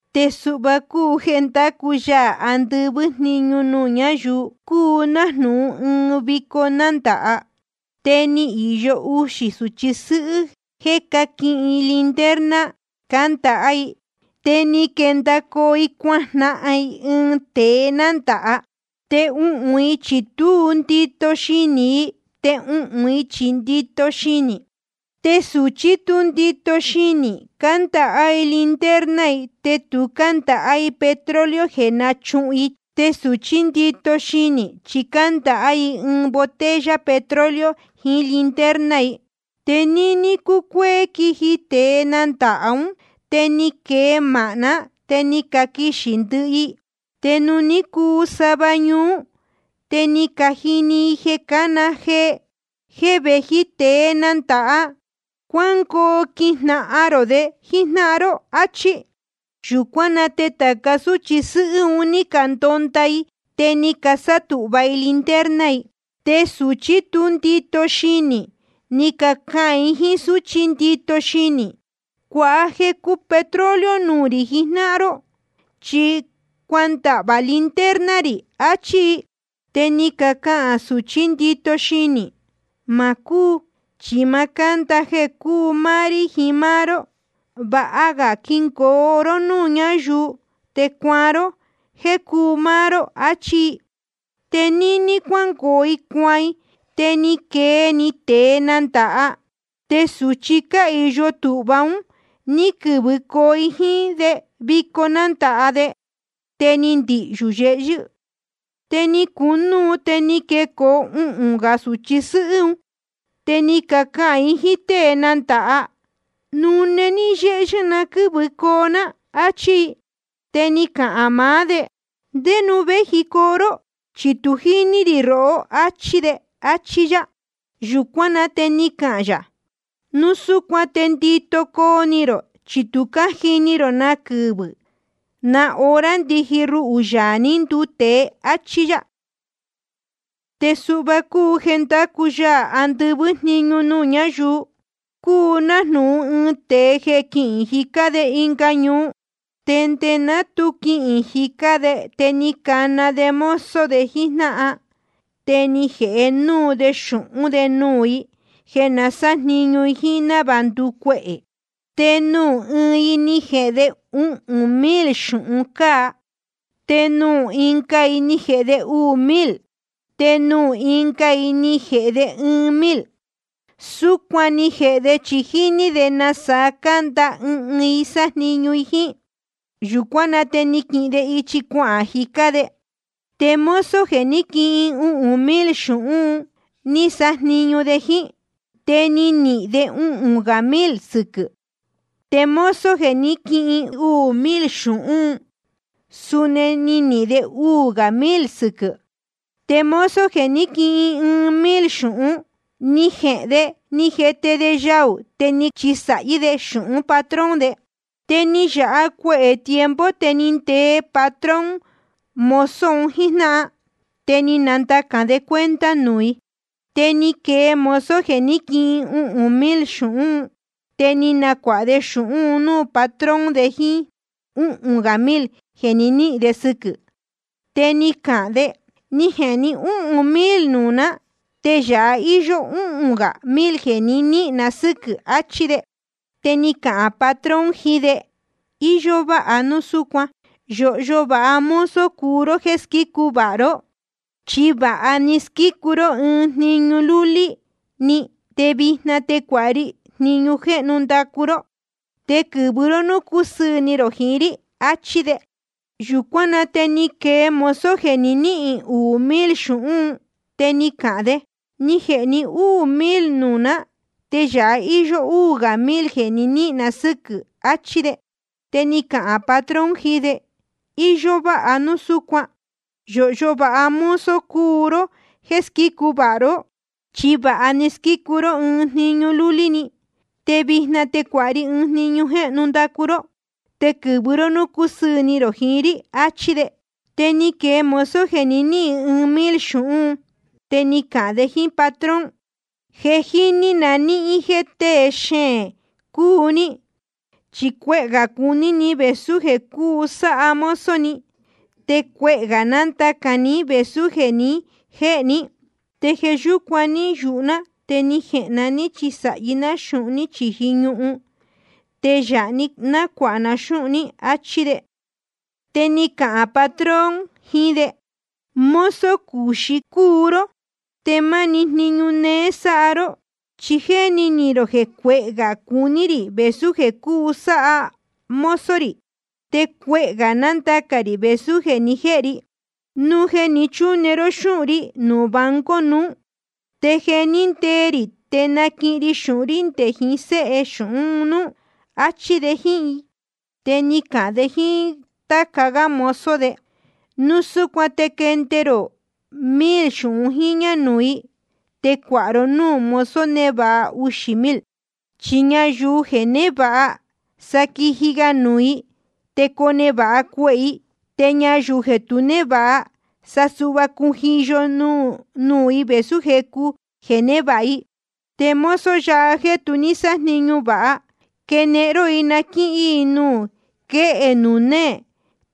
’Te suhva cúu jeē ndácu Yaā andɨvɨ́ jniñu nuū ñáyuu: Cúu nájnūhun ɨɨn vico nándāha. Te ni īyo uxī sūchi sɨ́hɨ́ jeē ní caquihin i linterna cándaha i, te ni quendacoo i cuajnahan i ɨɨn tēe nandāha. Te uhūn i chi tú ndito xinī i, te uhūn i chi ndito xinī i. Te sūchi tú ndito xinī, cándaha i linterna i, te tu cándaha i petróleo jeē náchuhun i. Te sūchí ndito xinī, chi cándaha i botella petróleo jiín linterna i. Te níní cúcuéé quiji tēe nandāha ún, te ni quee māhná, te ni caquixī ndɨhɨ i. Te nuū ní cuu sava ñuú, te ni cajini i jeē cácana jee: Je vēji tēe nandāha. Cuángoo quijnahan rō de jíjnáhan ró, áchí. Yūcuán na te tāca súchi sɨ́hɨ́ un ní candonda i, te ni casátūhva i linterna i. Te sūchi tú ndito xinī, ni cacahān i jíín súchi ndito xinī: Cuāha jecu petróleo nuū rī jijnáhan ró, chi cuandahvā linterna rī, achí i. Te ni cacahān sūchí ndito xinī: Ma cúu, chi ma cánda jeē cúu máá rí jiín máá ró. Vāha ga quingoo ró núū cúyāhu, te cuaan ró jéē cúu máá ró. Achí i. Te níní cuángoo i cuaan i, te ni quee‑ni tēe nandāha. Te sūchi cáhīyo tūhva un, ní quɨ̄vɨcoo i jíín de vico nándāha de. Te ni ndihyū yehyɨ́. Te ni cunúu, te ni quecoo uhūn gā sūchi sɨ́hɨ́ un. Te ni cacahān i jíín tée nándāha: Nune ní yéhyɨ́ na quɨ́vɨcoo ná, áchí i. Te ni cahān maá de: ¿Ndé nuū véjicoo ró? Chi tu jíní rī rohó, áchí de. Achí yá. Yūcuán na te ni cahān yā: Núu súcuan te ndito coo ni rō, chi tu cájini rō na quɨvɨ̄ na hora ndiji ruhū, Yaā ní nduu tēe. Achí yá. ’Te suhva cúu jeē ndácu Yaā andɨvɨ́ jniñu nuū ñáyuu: Cúu nájnūhun ɨɨn tēe jeē quihīn jicá de ɨnga ñuu. Te nde ná tu quihīn de te ni cana de mozo de jíjnáhan, te ni jēhe núu de xūhún de nuū i, jeē na sájniñu i jíín návāha nducuehē. ’Te nuū ɨɨn i ni jēhe de uhūn mil xūhun cáa. Te nuū ɨnga i ni jēhe de uū mil. Te nuū ɨnga i ni jēhe de ɨɨn mil. Súcuan ni jēhe de, chi jíní de nasaa canda ɨɨn ɨɨn i sájniñu i jíín. Yūcuán na te ni quihin de ichi cuahān jicá de. Te mozo jeē ní quihin uhūn mil xūhún, ni sájniñu de jíín. Te ni nihīn de uhūn gā mil sɨquɨ̄. Te mozo jeē ní quihin uū mil xūhún, suni ni nihīn de uū gā mil sɨquɨ̄. Te mozo jeē ní quihin ɨɨn mil xūhún, ni jehēn de ni jete de yaū, te ni chisāhí de xūhún patrón de. ’Te ni yāha cuehē tiempo, te ni ndee patrón mozo un jíjnáhan. Te ni nandacān de cuenta nuū i. Te ni quee mozo jeē ní quihin uhūn mil xūhún un, te ni nacuāha de xūhún un núū patrón de jíín úhūn gā mil jeē ni níhīn de sɨquɨ̄. Te ni cahān de: Ni jēhe ní úhūn mil nuū ná, te yāha íyó úhūn gā mil jeē ni níhīn na sɨ́quɨ̄. Achí de. Te ni cahān patrón jiín de: Iyó váha núu súcuan. Yōhyo vāha mozo cúu ró jéē squícu vāha ró. Chi vāha ni squícu ró ɨɨn jniñu lúlí‑ni, te vijna te cuāha ri jniñu jéhnu ndacu ró. Te quɨ̄vɨ ró núū cusɨɨ̄ ni rō jiín rí. Achí de. Yūcuán na te ni quee mozo jeē ní quihin uū mil xūhún un. Te ni cahān de: Ni jēhe ní úū mil nuū ná, te yāha íyó úū gā mil jeē ni níhīn na sɨ́quɨ̄. Achí de. Te ni cahān patrón jiín de: Iyó váha núu súcuan. Yōhyo vāha mozo cúu ró jéē squícu vāha ró. Chi vāha ni squícu ró ɨɨn jniñu lúlí‑ni, te vijna te cuāha ri jniñu jéhnu ndacu ró. Te quɨ̄vɨ ró núū cusɨɨ̄ ni rō jiín rí. Achí de. Te ni quee mozo jeē ní quihin ɨɨn mil xūhún un, te ni cahān de jíín patrón: Je jíní na níhín jéē tée xeēn cúu ní. Chi cuehē gā cuní ni vēsú jeē cúu sáha mozo ni, te cuehē gā nándacān ní vēsú jeē ni jéhe ní. Te jeē yúcuan ní yūhu ná, te ni jehēn na ní chisāhi ná xūhun ní chīji ñuhun. Te yāhá na nácuāha na xúhun ní. Achí de. Te ni cahān patrón jiín de: Mozo cuxí cúu ró te máni jniñu néé sáha ró. Chi jéni ni rō jeē cuehē gā cuní rī vēsú jeē cuu sáha mozo rī, te cuehē gā nándacān rī vēsú jeē ni jéhe ri. Núu jeē ni chúne ró xúhun rí nuū banco nuú, te jeē ní ndee rī te naquihin ri xūhun rí nde jiín séhe xūhun núú. Achí de jíín i. Te ni cahān de jíín táca gá mozo de: Núu súcuan te quende rō mil xūhun jíñā nuū i, te cuāha ro núū mozo névāha uxī mil. Chi ñayuu jeē névāha, sa quiji ga nuū i, te conevāha cuehē i. Te ñayuu jeē tu névāha, sa cujiyo‑ni vēsú jecu jeē névāha i. Te mozo yáha jéē tu sájniñu vāha, quenehen ró i na quíhín i nuū quéhe nuū néē.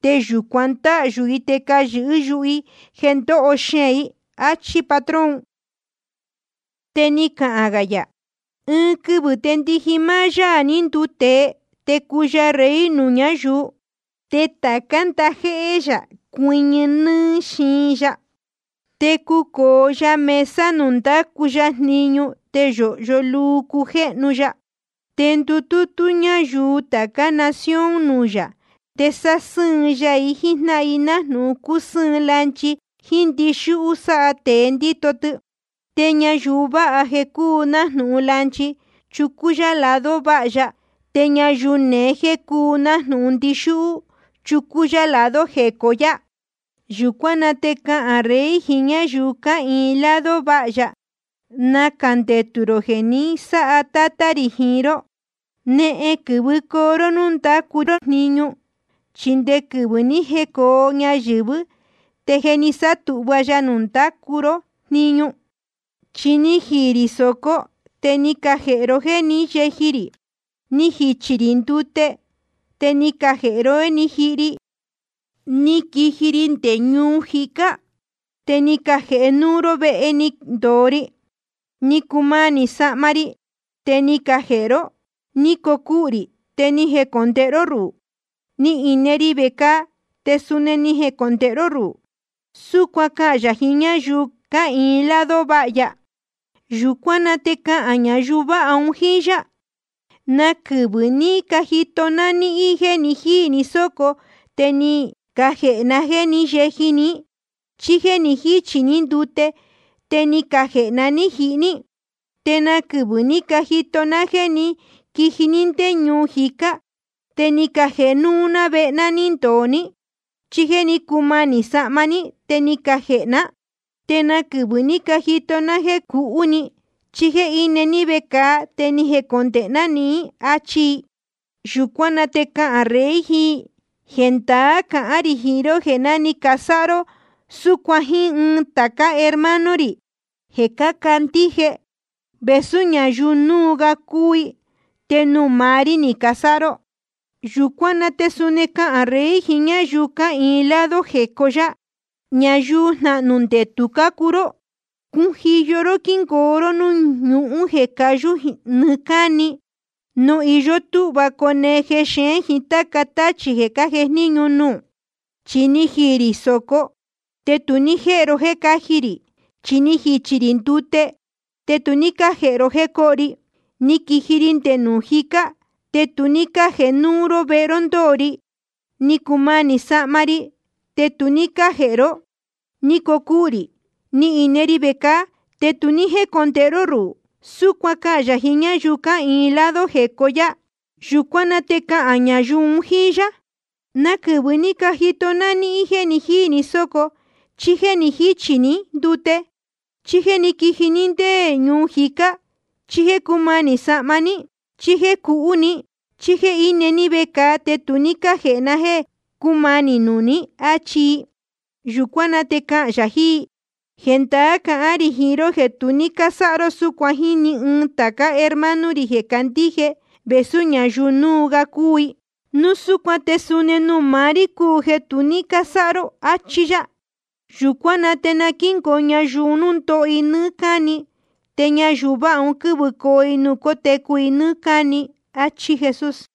Te yūcuan ndáhyū i te nacayɨ̄hɨ́ yuhu i jeē ndoho xeēn i. Achí patrón un. Te ni cahān gā yā: Ɨɨn quɨvɨ̄ te ndiji máá Yaā ní nduu tēe, te cuu ya Rey nuū ñáyuu. Te tācá ndajéhé yā cuɨñɨ nɨ́ɨ́ xiin ya. Te cucōo ya mesa nuū ndácu ya jniñu, te yōhyo luu cujéhnu ya. Te ndutútú ñayuu tācá nación nuū yā. Te sásɨ́ɨn ya i jíjnáhan i, nájnūhun cúsɨ́ɨn lanchi jíín ndixúhú sáha tēe ndíto tɨ. Te ñayuu váha jeē cúu nájnūhun lanchi, chucú yá i lado váha ya. Te ñayuu neé jeē cúu nájnūhun ndixúhú, chucú yá i lado jecó yá. Yūcuán na te cahān Rey jiín ñáyuu cáhīin lado váha ya: Nacā ndetū rō jeē ni sáha Tátá rī jiín ró. Nehen quɨ̄vɨcoo ró núū ndácu ró jniñu. Chi nde quɨvɨ̄ ní jecōo ñayɨ̄vɨ́ te je ni sátūhva ya nuū ndacu ró jniñu. Chi ni jiī rī sōco, te ni cajēhe ro jéē ní yeji rī. Ni jichī rī ndute, te ni cajēhe ró jéē ní jihi ri. Ni quiji ri nde ñuu jicá, te ni cajēhe núú ró vehe ni ndōo ri. Ni cumanī sahma ri, te ni cajēhe ró. Ni cocuhū rī, te ni jecondēhe ró ruhū. Ni ine ri vecāa, te suni ni jecondēhe ró ruhū. Súcuan cahān yā jiín ñáyuu cáhīin lado váha ya. Yūcuán na te cahān ñayuu váha un jíín yá: ¿Na quɨvɨ̄ ní cajito ná níhín jéē jíī ni sóco, te ni cajēhe na jéē ní yeji ní, chí jéē jichí ni ndute, te ni cajēhe ná ní jihi ní? ¿Te na quɨvɨ̄ ní cajito ná jéē ní quiji ní ndé ñuu jicá, te ni cajēhe núú ná vehe ni ndōo ní, chí jéē cúmanī sahma ní, te ni cajēhe ná? ¿Te na quɨvɨ̄ ní cajito ná jéē cuhú ni, chí jéē íne ní vecāa, te ni jecondēhe ná nihín? achi i. Yūcuán na te cahān Rey jiín i: Jendaá cahán rī jiín ró jéē ná ni casáha ró súcuan jíín ɨɨn tācá hermano rī jeē cácandíje, vēsú ñayuu núu ga cúu i, te nuū maá rí ni casáha ró. ’Yūcuán na te suni cahān Rey jiín ñáyuu cáhīin lado jecó yá: Ñayuu jnahnū ndetū cácuu ró. Cujiyo quingoo ró núū ñuhún jeē cayú nɨɨ́ cáni, nuū iyó túhva cone jexeén jiín táca táchī jeē cájejníñu nuū. Chi ni jiī rī sōco, te tu ní cájēhe ro jéē cáji rī. Ni jichī rī ndute, te tu ní cájēhe ro jéē coho ri. Ni quiji ri nde ñuu jicá, te tu ní cájēhe núú ró vehe ndōo ri. Ni cumanī sahma ri, te tu ní cájēhe ró. Ni cocuhū rī, ni ine ri vecāa, te tu ní jécondēhe ró ruhū. Súcuan cahān yā jiín ñáyuu cáhīin lado jecó yá. Yūcuán na te cahān ñayuu un jíín yá: ¿Na quɨvɨ̄ ní cajito na níhín jéē jíī ni sóco, chí jéē jichí ni ndute, chí jéē ní quiji ní ndé ñuu jicá, chí jéē cúmanī sahma ní, chí jéē cuhú ni, chí jéē íne ní vecāa, te tu ní cájēhe na jéē cúmanī nuū ní? Achi i. Yūcuán na te cahān yā jiín i: Jendaá cahán rī jiín ró, jeē tu ní cásáha ró súcuan jíín ni ɨɨn tācá hermano rī jeē cácandíje, vēsú ñayuu núu ga cúu i. Núu súcuan te suni nuū maá rí cúu jeē tu ní cásáha ró, achi yā. Yūcuán na te quingoo ñayuu un núū ndóho i nɨ́ɨ́ cáni. Te ñayuu váha un quɨ́vɨcoo i nuū cótecu i nɨ́ɨ́ cáni. Achí Jesús.